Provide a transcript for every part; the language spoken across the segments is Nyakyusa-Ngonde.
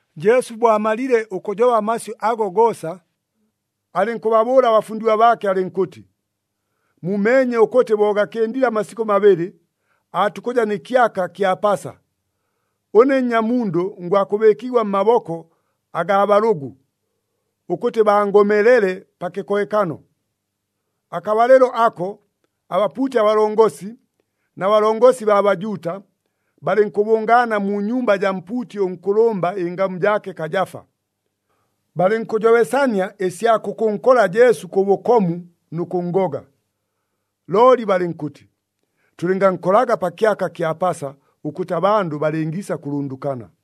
Jesu bo amalile ʉkʉjoba amasyʉ ago goosa, alɨnkʉbabʉʉla abafundigwa baake alɨnkʉtɨ, “Mumeenye ʉkʉtɨ bo gakɨndile amasikʉ mabɨlɨ, aatukʉja nɨ kyaka kya Pasa. Ʉne Nnyamundʉ ngwakʉbɨɨkigwa mmaboko agaa balʉgʉ, ʉkʉtɨ bangomelele pa kɨkohekano.” Akabalɨlo ako, abapuuti abalongosi na balongosi baa Bajuuta, balɨnkʉbʉngaana mu nyumba jaa mpuuti ʉnkʉlʉmba, ɨngamu jaake Kajafa. Balɨnkʉjobesania ɨsya kʉkʉnkola Jesu kʉ bʉkomu nʉ kʉnngoga. Looli balɨnkʉtɨ, “Tʉlɨngankolaga pa kyaka kya Pasa ʉkʉtɨ abandʉ balɨngiisa kʉlʉndʉkana.”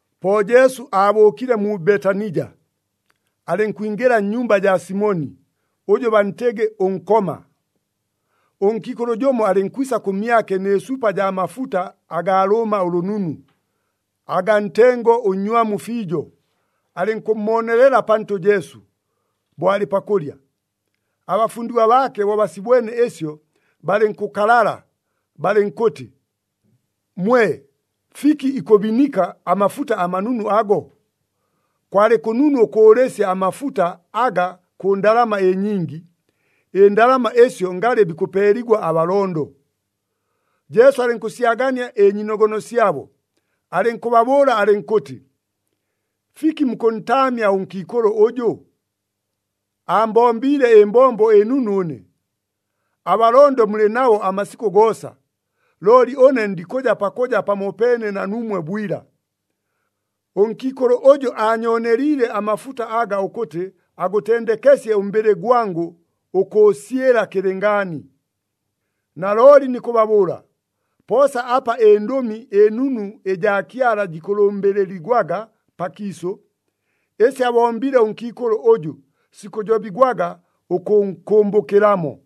Po Jesu aabʉʉkile mu Betanija, alɨnkwingɨla nnyumba jaa Simoni, ʉjʉ bantɨgɨ ʉNkoma. Ʉnkiikʉlʉ jʉmo alɨnkwisa kʉmyake nɨ supa jaa mafuta agaa lʉʉma ʉlʉnunu, agaa ntengo ʉnnywamu fiijo, alɨnkʉmmoonelela pantʉ Jesu, bo alɨ pakʉlya. Abafundigwa baake bo basibwene ɨsyo, balɨnkʉkalala, balɨnkʉtɨ, “Mwe! Fiki ikʉbinika amafuta amanunu ago? Kwalɨ kʉnunu ʉkʉʉlɨsya amafuta aga kʉ ndalama ɨnyingi, ɨndalama ɨsyo ngalɨ bikʉpeeligwa abalondo!” Jesu alɨnkʉsyagania ɨnyiinogono syabo, alɨnkʉbabʉʉla alɨnkʉtɨ, “Fiki mukʉntaamya ʉnkiikʉlʉ ʉjʉ? Aambombiile ɨmbombo ɨnunu ʉne. Abalondo mulɨ nabo amasikʉ goosa. Looli ʉne ndikʉja pakʉja pamopeene na nuumwe bwila. Ʉnkiikʉlʉ ʉjʉ aanyooneliile amafuta aga ʉkʉtɨ agʉtendekesye ʉmbɨlɨ gwangʉ ʉkʉʉsyɨla kɨlɨngaani. Nalooli nikʉbabʉʉla, poosa apa ɨNdʉmi ɨNunu ɨjaa Kyala jikʉlʉmbɨlɨligwaga pakiisʉ, ɨsi abombile ʉnkiikʉlʉ ʉjʉ, sikʉjobigwaga ʉkʉnkʉmbʉkɨlamo.”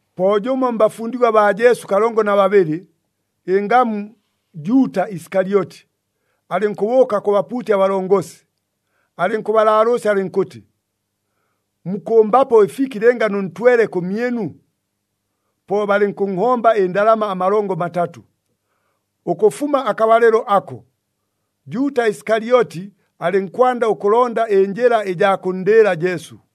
Po jʉmo mbafundigwa baa Jesu kalongo na babɨlɨ, ɨngamu Juuta Isikalyoti, alɨnkʉbʉʉka kʉ bapuuti abalongosi, alɨnkʉbalaalʉʉsya alɨnkʉtɨ, “Mukʉmbapo ɨfiki lɨnga nʉntwele kʉmyɨnu?” Po balɨnkʉnhomba ɨndalama amalongo matatʉ. Ʉkʉfuma akabalɨlo ako, Juuta Isikalyoti alɨnkwanda ʉkʉlonda ɨnjɨla ɨjaa kʉnndɨɨla Jesu.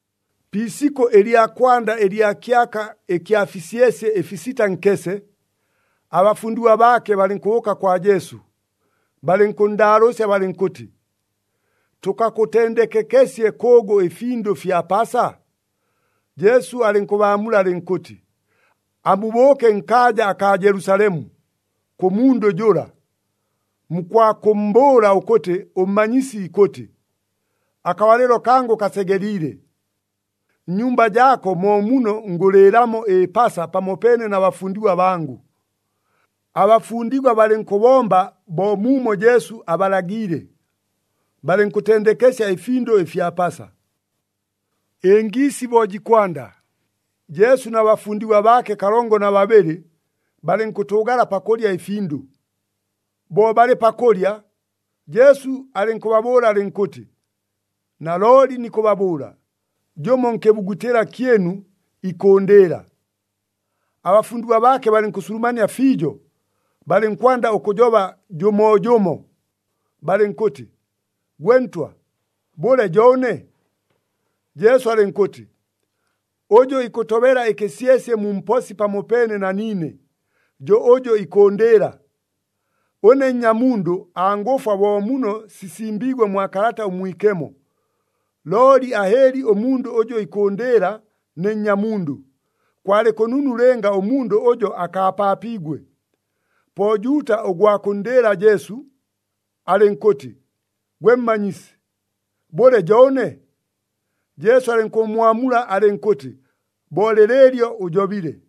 Pi isikʉ ɨlya kwanda ɨlya kyaka ɨkya fisyesye ɨfisita nkese, abafundigwa baake balɨnkʉbʉʉka kwa Jesu, balɨnkʉnndaalʉʉsya balɨnkʉtɨ, “Tʉkakʉtendekekesye kʉʉgʉ ɨfindʉ fya Pasa?” Jesu alɨnkʉbaamula alɨnkʉtɨ, “Amubʉʉke nkaaja akaa Jelusalemu, kʉ mundʉ jʉla, mukwakʉmmbʉʉla ʉkʉtɨ ʉMmanyisi ikʉtɨ, ‘Akabalɨlo kangʉ kasegeliile. Nnyumba jaako mo muno ngʉlɨɨlamo ɨPasa pamopeene na bafundigwa bangʉ.’” Abafundigwa balɨnkʉbomba bo muumo Jesu abalagiile, balɨnkʉtendekesya ɨfindʉ fya Pasa. Ɨngiisi bo jikwanda, Jesu na bafundigwa baake kalongo na babɨlɨ, balɨnkʉtʉʉgala pakʉlya ɨfindʉ. Bo balɨ pakʉlya, Jesu alɨnkʉbabʉʉla alɨnkʉtɨ, “Nalooli nikʉbabʉʉla, jʉmo nkɨbugutɨla kyɨnu, ikʉʉndɨɨla.” Abafundigwa baake balɨnkʉsulumania fiijo, balɨnkwanda ʉkʉjoba jʉmoojʉmo balɨnkʉtɨ, “Gwe Ntwa, bʉle jo ʉne?” Jesu alɨnkʉtɨ, “Ʉjʉ ikʉtobela ɨkɨsyesye mu mposi pamopeene na niine, jo ʉjʉ ikʉʉndɨɨla. Ʉne Nnyamundʉ, angʉfwa bo muno sisimbiigwe mwa Kalata ʉMwikemo. Looli ahɨɨli ʉmundʉ ʉjʉ ikʉʉndɨɨla ne Nnyamundʉ. Kwalɨ kʉnunu lɨnga ʉmundʉ ʉjo akaapaapiigwe!” Po Juuta ʉgwa kʉnndɨɨla Jesu, alɨnkʉtɨ, “Gwe Mmanyisi, bʉle jo ʉne?” Jesu alɨnkʉmmwamula alɨnkʉtɨ, “Bo lɨlɨɨlyo ʉjobile.”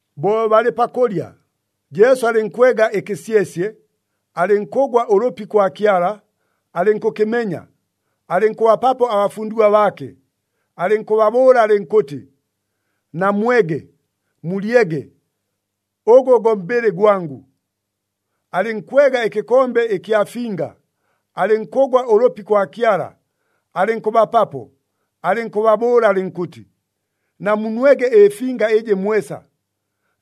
Bo balɨ pakʉlya, Jesu alɨnkwega ɨkɨsyesye, alɨnkʉgwa ʉlʉpi kwa Kyala, alɨnkʉkɨmenya, alɨnkʉbapapo abafundigwa baake, alɨnkʉbabʉʉla alɨnkʉtɨ, “Namwege, mulyege, ʉgʉ go mbɨlɨ gwangʉ.” Alɨnkwega ɨkɨkombe ɨkya finga, alɨnkʉgwa ʉlʉpi kwa Kyala, alɨnkʉbapapo, alɨnkʉbabʉʉla alɨnkʉtɨ, “Namunwege ɨfinga ɨjɨ mwesa,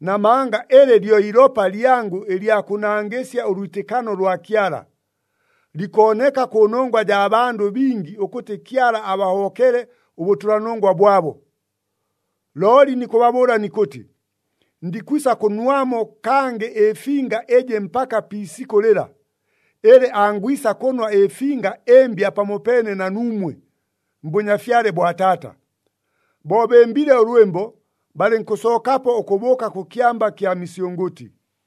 namanga ɨlɨ lyo ilopa lyangʉ ɨlya kʉnangɨsya ʉlwitɨkano lwa Kyala. Likooneka kʉnongwa jaa bandʉ bingi ʉkʉtɨ Kyala abahobokele ʉbʉtʉlanongwa bwabo. Looli nikʉbabʉʉla nikʉtɨ, ndikwisa kʉnwamo kangɨ ɨfinga ɨjɨ mpaka pi isikʉ lɨla, ɨlɨ angwisa kʉnwa ɨfinga ɨmbya pamopeene na nuumwe, mBʉnyafyale bwa Taata.” Bo bɨmbile ʉlwɨmbo, balɨnkʉsookapo ʉkʉbʉʉka kʉ Kyamba kya Misyʉngʉtɨ.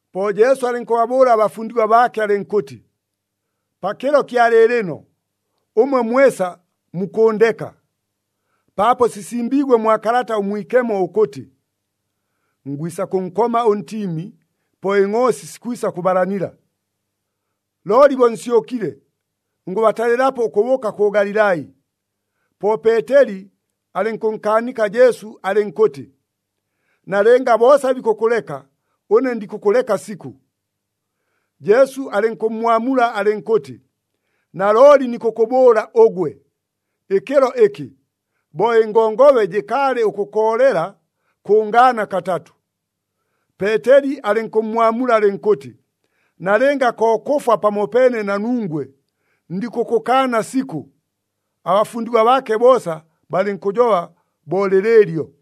Po Jesu alɨnkʉbabʉʉla abafundigwa baake alɨnkʉtɨ, “Pakɨlo kya lɨɨlɨno, ʉmwe mwesa mukʉʉndeka. Paapo sisimbiigwe mwa Kalata ʉMwikemo ʉkʉtɨ, ‘Ngwisa kʉnkoma ʉntiimi, po ɨngʼoosi sikwisa kʉbalanila.’ Looli bo nsyʉkile, ngʉbatalɨlapo ʉkʉbʉʉka kʉ Galilai.” Po Peeteli alɨnkʉnkaanika Jesu alɨnkʉtɨ, “Nalɨnga boosa bikʉkʉleka, ʉne ndikʉkʉleka sikʉ!” Jesu alɨnkʉmmwamula alɨnkʉtɨ, “Nalooli nikʉkʉbʉʉla ʉgwe, ɨkɨlo ɨkɨ, bo ɨngongobe jɨkaalɨ ʉkʉkoolela, kʉngaana katatʉ.” Peeteli alɨnkʉmmwamula alɨnkʉtɨ, “Nalɨnga ko kʉfwa pamopeene na nungwe, ndikʉkʉkaana sikʉ!” Abafundigwa baake boosa balɨnkʉjoba bo lɨlɨɨlyo.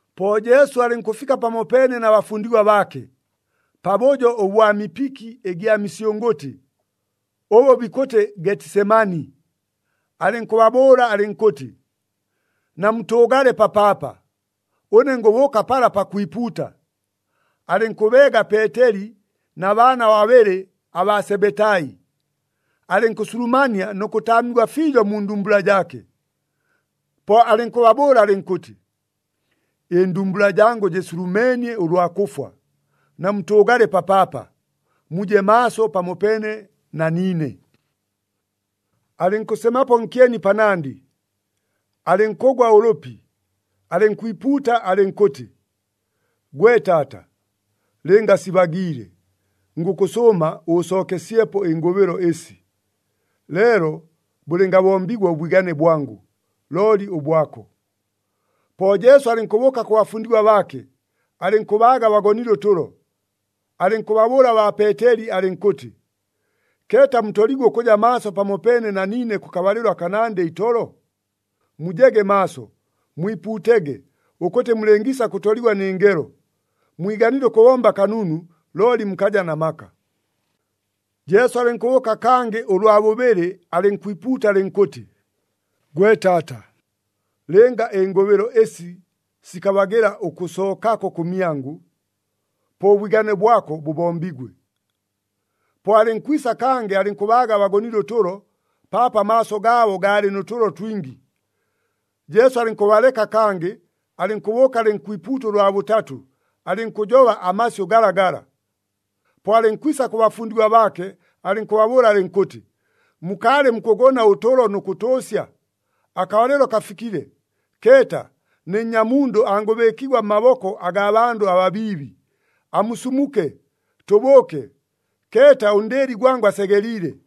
Po Jesu alɨnkʉfika pamopeene na bafundigwa baake, pabʉjo ʉbwa mipiki ɨgya misyʉngʉtɨ, ʉbʉ bikʉtɨ Getisemani, alɨnkʉbabʉʉla alɨnkʉtɨ, “Namutʉʉgale papaapa, ʉne ngʉbʉʉka pala pakwipuuta.” Alɨnkʉbeega Peeteli na baana babɨlɨ abaa Sebetai, alɨnkʉsulumania nʉ kʉtaamigwa fiijo mu ndumbula jaake. Po alɨnkʉbabʉʉla alɨnkʉtɨ, “Ɨndumbula jangʉ jɨsulumeenie ʉlwa kʉfwa. Namutʉʉgale papaapa, muje maaso pamopeene na niine.” Alɨnkʉsemapo nkyeni panandɨ, alɨnkʉgwa ʉlʉpi, alɨnkwipuuta alɨnkʉtɨ, “Gwe Taata! Lɨnga sibagiile, ngʉkʉsʉʉma ʉʉsookesyepo ɨngʉbɨlo ɨsi. Leelo bʉlɨngabombigwa ʉbwigane bwangʉ, looli ʉbwako.” Po Jesu alɨnkʉbʉʉka kʉ bafundigwa baake, alɨnkʉbaaga bagonile ʉtʉlo. Alɨnkʉbabʉʉla baa Peeteli alɨnkʉtɨ, “Keeta mutoliigwe ʉkʉja maaso pamopeene na niine kʉkabalɨlo akanandɨ itolo? Mujege maaso, mwipuutege, ʉkʉtɨ mulɨngiisa kʉtoligwa nɨ ngelo. Mwiganile ʉkʉbomba kanunu, looli mukaja na maka.” Jesu alɨnkʉbʉʉka kangɨ ʉlwa bʉbɨlɨ, alɨnkwipuuta alɨnkʉtɨ, “Gwe Taata, lɨnga ɨngʉbɨlo ɨsi sikabagɨla ʉkʉsookako kʉmyangʉ, po ʉbwigane bwako bʉbombigwe.” Po alɨnkwisa, kangɨ alɨnkʉbaaga bagonile ʉtʉlo, paapo amaaso gaabo gaalɨ nʉ tʉlo twingi. Jesu alɨnkʉbaleka kangɨ, alɨnkʉbʉʉka alɨnkwipuuta ʉlwa bʉtatʉ, alɨnkʉjoba amasyʉ galagala. Po alɨnkwisa kʉ bafundigwa baake, alɨnkʉbabʉʉla alɨnkʉtɨ, “Mukaalɨ mukʉgona ʉtʉlo nʉ kʉtʉʉsya? Akabalɨlo kafikile! Keeta, ne Nnyamundʉ angʉbɨɨkigwa mmaboko agaa bandʉ ababiibi. Amusumuke! Tʉbʉʉke. Keeta, ʉndɨɨli gwangʉ asegeliile.”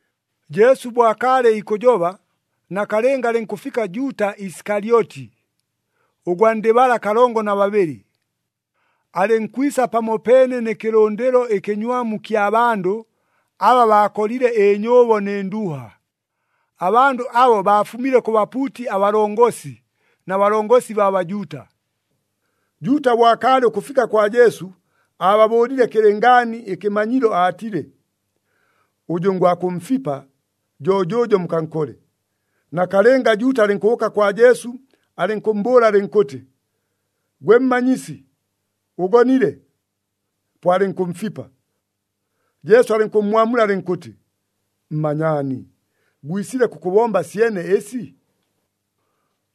Jesu bo akaalɨ ikʉjoba, nakalɨnga alɨnkʉfika Juuta Isikalyoti, ʉgwa ndɨ bala kalongo na babɨlɨ, alɨnkwisa pamopeene nɨ kɨlʉndɨlo ɨkɨnywamu kya bandʉ aba baakolile ɨnyʉʉbo nɨ nduuha. Abandʉ abo baafumile kʉ bapuuti abalongosi na balongosi baa Bajuuta. Juuta bo akaalɨ ʉkʉfika kwa Jesu, aababʉʉlile kɨlɨngaani ɨkɨmanyilo aatile, “Ʉjʉ ngwakʉmfipa, jo jʉʉjo, mukankole.” Nakalɨnga, Juuta alɨnkʉbʉʉka kwa Jesu, alɨnkʉmmbʉʉla alɨnkʉtɨ, “Gwe Mmanyisi, ʉgonile!” Po alɨnkʉmfipa. Jesu alɨnkʉmmwamula alɨnkʉtɨ, “Mmanyaani, gwisile kʉkʉbomba syene ɨsi?”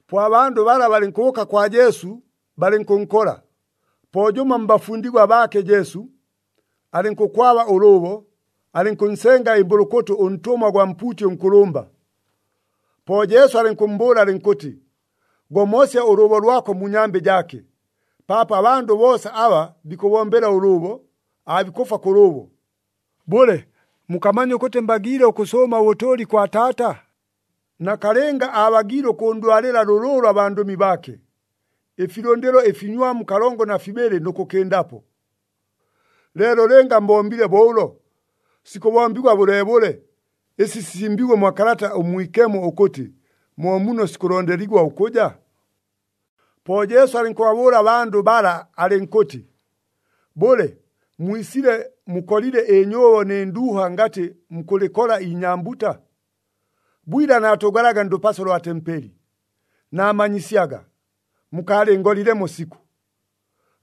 Po abandʉ bala balɨnkʉbʉʉka kwa Jesu, balɨnkʉnkola. Po jʉmo mbafundigwa baake Jesu, alɨnkʉkwaba ʉlʉʉbo, alɨnkʉnsenga ɨmbʉlʉkʉtʉ ʉntʉmwa gwa mpuuti ʉnkʉlʉmba. Po Jesu alɨnkʉmmbʉʉla alɨnkʉtɨ, “Gomosya ʉlʉʉbo lwako mu nyambɨ jaake, paapo abandʉ boosa aba bikʉbombela ʉlʉʉbo, aabikʉfwa kʉ lʉʉbo. Bʉle, mukamanya ʉkʉtɨ mbagiile ʉkʉsʉʉma ʉbʉtʉʉli kwa Taata? Nakalɨnga aabagiile ʉkʉndwalɨla lʉlʉʉlʉ abandʉmi baake, ɨfilʉndɨlo ɨfinywamu kalongo na fibɨlɨ nʉ kʉkɨndapo. Leelo lɨnga mbombile bo ʉlo, sikʉbombigwa bʉleebʉle ɨsi sisimbiigwe mwa Kalata ʉMwikemo, ʉkʉtɨ mo muno sikʉlondeligwa ʉkʉja?” Po Jesu alɨnkʉbabʉʉla abandʉ bala alɨnkʉtɨ, “Bʉle, mwisile mukolile ɨnyʉʉbo nɨ nduuha ngatɨ mukʉlɨkola inyambuta? Bwila naatʉʉgalaga ndʉpaso lwa tempeli, naamanyisyaga, mukaalɨngolilemo sikʉ!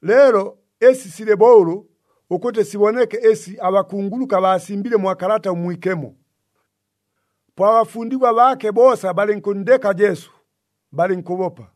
Leelo ɨsi silɨ bo ʉlʉ, ʉkʉtɨ siboneke ɨsi abakunguluka baasimbile mwa Kalata ʉMwikemo.” Po abafundigwa baake boosa balɨnkʉnndeka Jesu, balɨnkʉbopa.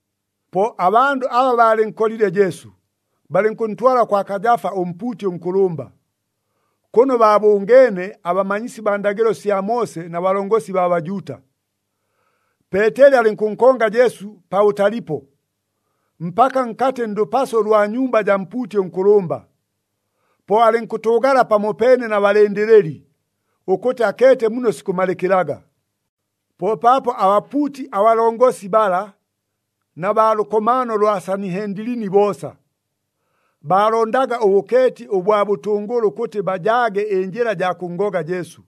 Po abandʉ aba baalɨnkolile Jesu, balɨnkʉntwala kwa Kajafa ʉmpuuti ʉnkʉlʉmba, kʉno baabʉngeene abamanyisi baa ndagɨlo sya Moose na balongosi baa Bajuuta. Peeteli alɨnkʉnkonga Jesu pabʉtalipo, mpaka nkatɨ ndʉpaso lwa nnyumba jaa mpuuti ʉnkʉlʉmba. Po alɨnkʉtʉʉgala pamopeene na balɨndɨlɨli, ʉkʉtɨ akeete muno sikʉmalɨkɨlaga. Po paapo abapuuti abalongosi bala na baa lʉkomaano lwa Sanihendilini boosa, baalondaga ʉbʉkeeti ʉbwa bʉtʉngʉlʉ ʉkʉtɨ bajaage ɨnjɨla ɨjaa kʉnngoga Jesu.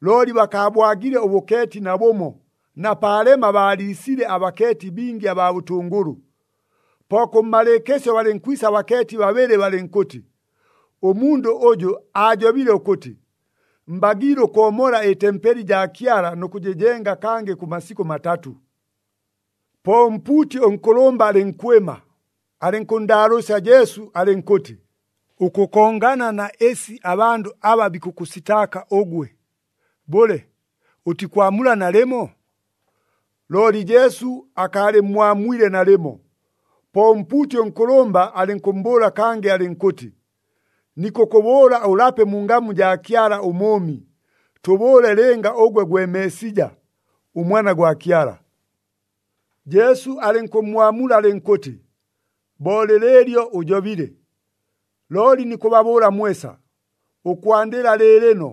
Looli bakaabwagile ʉbʉkeeti nabʉmo na paalema baaliisile abakeeti bingi abaa bʉtʉngʉlʉ. Po kʉmmalɨɨkɨsyo balɨnkwisa abakeeti babɨlɨ balɨnkʉtɨ, “Ʉmundʉ ʉjʉ aajobile ʉkʉtɨ, ‘Mbagiile ʉkoomola ɨtempeli jaa Kyala nʉ kʉjɨjenga kangɨ kʉ masikʉ matatʉ.’” Po ʉmpuuti ʉnkʉlʉmba alɨnkwɨma, alɨnkʉnndaalʉʉsya Jesu alɨnkʉtɨ, “Ʉkʉkongana na ɨsi abandʉ aba bikʉkʉsitaaka ʉgwe, bʉle ʉtikwamula nalɨmo?” Looli Jesu akaalɨmmwamwile nalɨmo. Po ʉmpuuti ʉnkʉlʉmba alɨnkʉmmbʉʉla kangɨ alɨnkʉtɨ, “Nikʉkʉbʉʉla ʉlape mu ngamu jaa Kyala ʉMʉʉmi, tʉbʉʉle lɨnga ʉgwe gwe Meesija, ʉMwana gwa Kyala.” Jesu alɨnkʉmmwamula alɨnkʉtɨ, “Bo lɨlɨɨlyo ʉjobile. Looli nikʉbabʉʉla mwesa, ʉkwandɨla lɨɨlɨno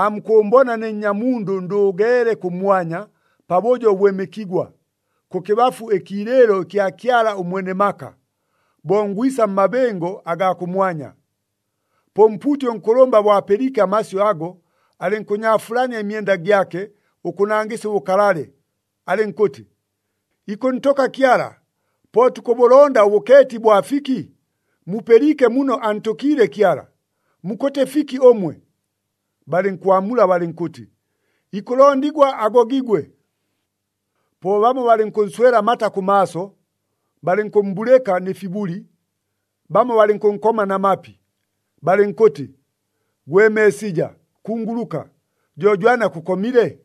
aamukʉʉmbona ne Nnyamundʉ ndʉʉgeele kʉmwanya, pabʉjo ʉbwɨmɨkigwa, kʉkɨbafu ɨkiilɨɨlo ɨkya Kyala ʉMwene maka, bo ngwisa mmabɨngo agaa kʉmwanya.” Po ʉmpuuti ʉnkʉlʉmba bo apɨliike amasyʉ ago, alɨnkʉnyaafulania ɨmyenda gyake ʉkʉnangɨsya ʉbʉkalale, alɨnkʉtɨ, “Ikʉntʉka Kyala! Po tukʉbʉlonda ʉbʉkeeti bwa fiki? Mupɨliike muno antʉkiile Kyala! Mukʉtɨ fiki ʉmwe?” Balɨnkwamula balɨnkʉtɨ, “Ikʉlondigwa agogigwe!” Po bamo balɨnkʉnswela amata kʉmaaso, balɨnkʉmmbulɨka nɨ fibuli, bamo balɨnkʉnkoma na mapi, balɨnkʉtɨ, “Gwe Meesija, kunguluka! Jo jwani akʉkomile?”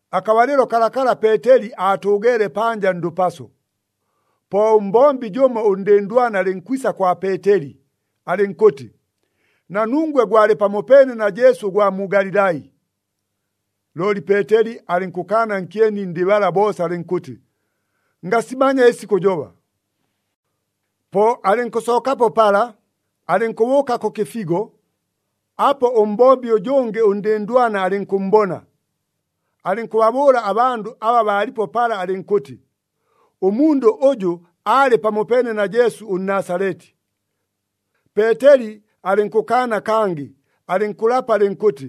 Akabalɨlo kalakala Peeteli aatʉʉgeele panja ndʉpaso. Po ʉmbombi jʉmo ʉndɨndwana alɨnkwisa kwa Peeteli, alɨnkʉtɨ, “Na nungwe gwalɨ pamopeene na Jesu ʉgwa mu Galilai.” Looli Peeteli alɨnkʉkaana nkyeni ndɨ bala boosa alɨnkʉtɨ, “Ngasimanya ɨsi kʉjoba!” Po alɨnkʉsookapo pala, alɨnkʉbʉʉka kʉ kɨfigo. Apo ʉmbombi ʉjʉngɨ ʉndɨndwana alɨnkʉmmbona, alɨnkʉbabʉʉla abandʉ aba baalipo pala alɨnkʉtɨ, “Ʉmundʉ ʉjʉ aalɨ pamopeene na Jesu ʉNnasaleti.” Peeteli alɨnkʉkaana kangɨ, alɨnkʉlapa alɨnkʉtɨ,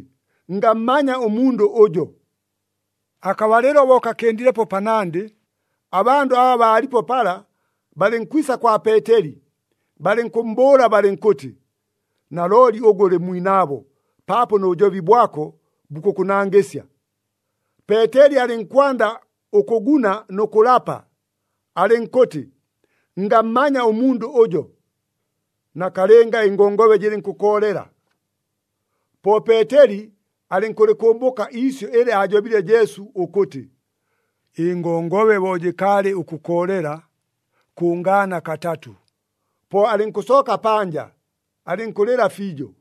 “Ngammanya ʉmundʉ ʉjo!” Akabalɨlo bo kakɨndilepo panandɨ, abandʉ aba baalipo pala balɨnkwisa kwa Peeteli, balɨnkʉmmbʉʉla balɨnkʉtɨ, “Nalooli ʉgwe ʉlɨ mwinaabo, paapo nʉ bʉjobi bwako bukʉkʉnangɨsya!” Peeteli alɨnkwanda ʉkʉguna nʉ kʉlapa, alɨnkʉtɨ, “Ngammanya ʉmundʉ ʉjo!” Nakalɨnga ɨngongobe jɨlɨnkʉkoolela. Po Peeteli alɨnkʉlɨkʉmbʉka iisyʉ ɨlɨ aajobile Jesu ʉkʉtɨ, “Ɨngongobe bo jɨkaalɨ ʉkʉkoolela, kʉngaana katatʉ.” Po alɨnkʉsooka panja, alɨnkʉlɨla fiijo.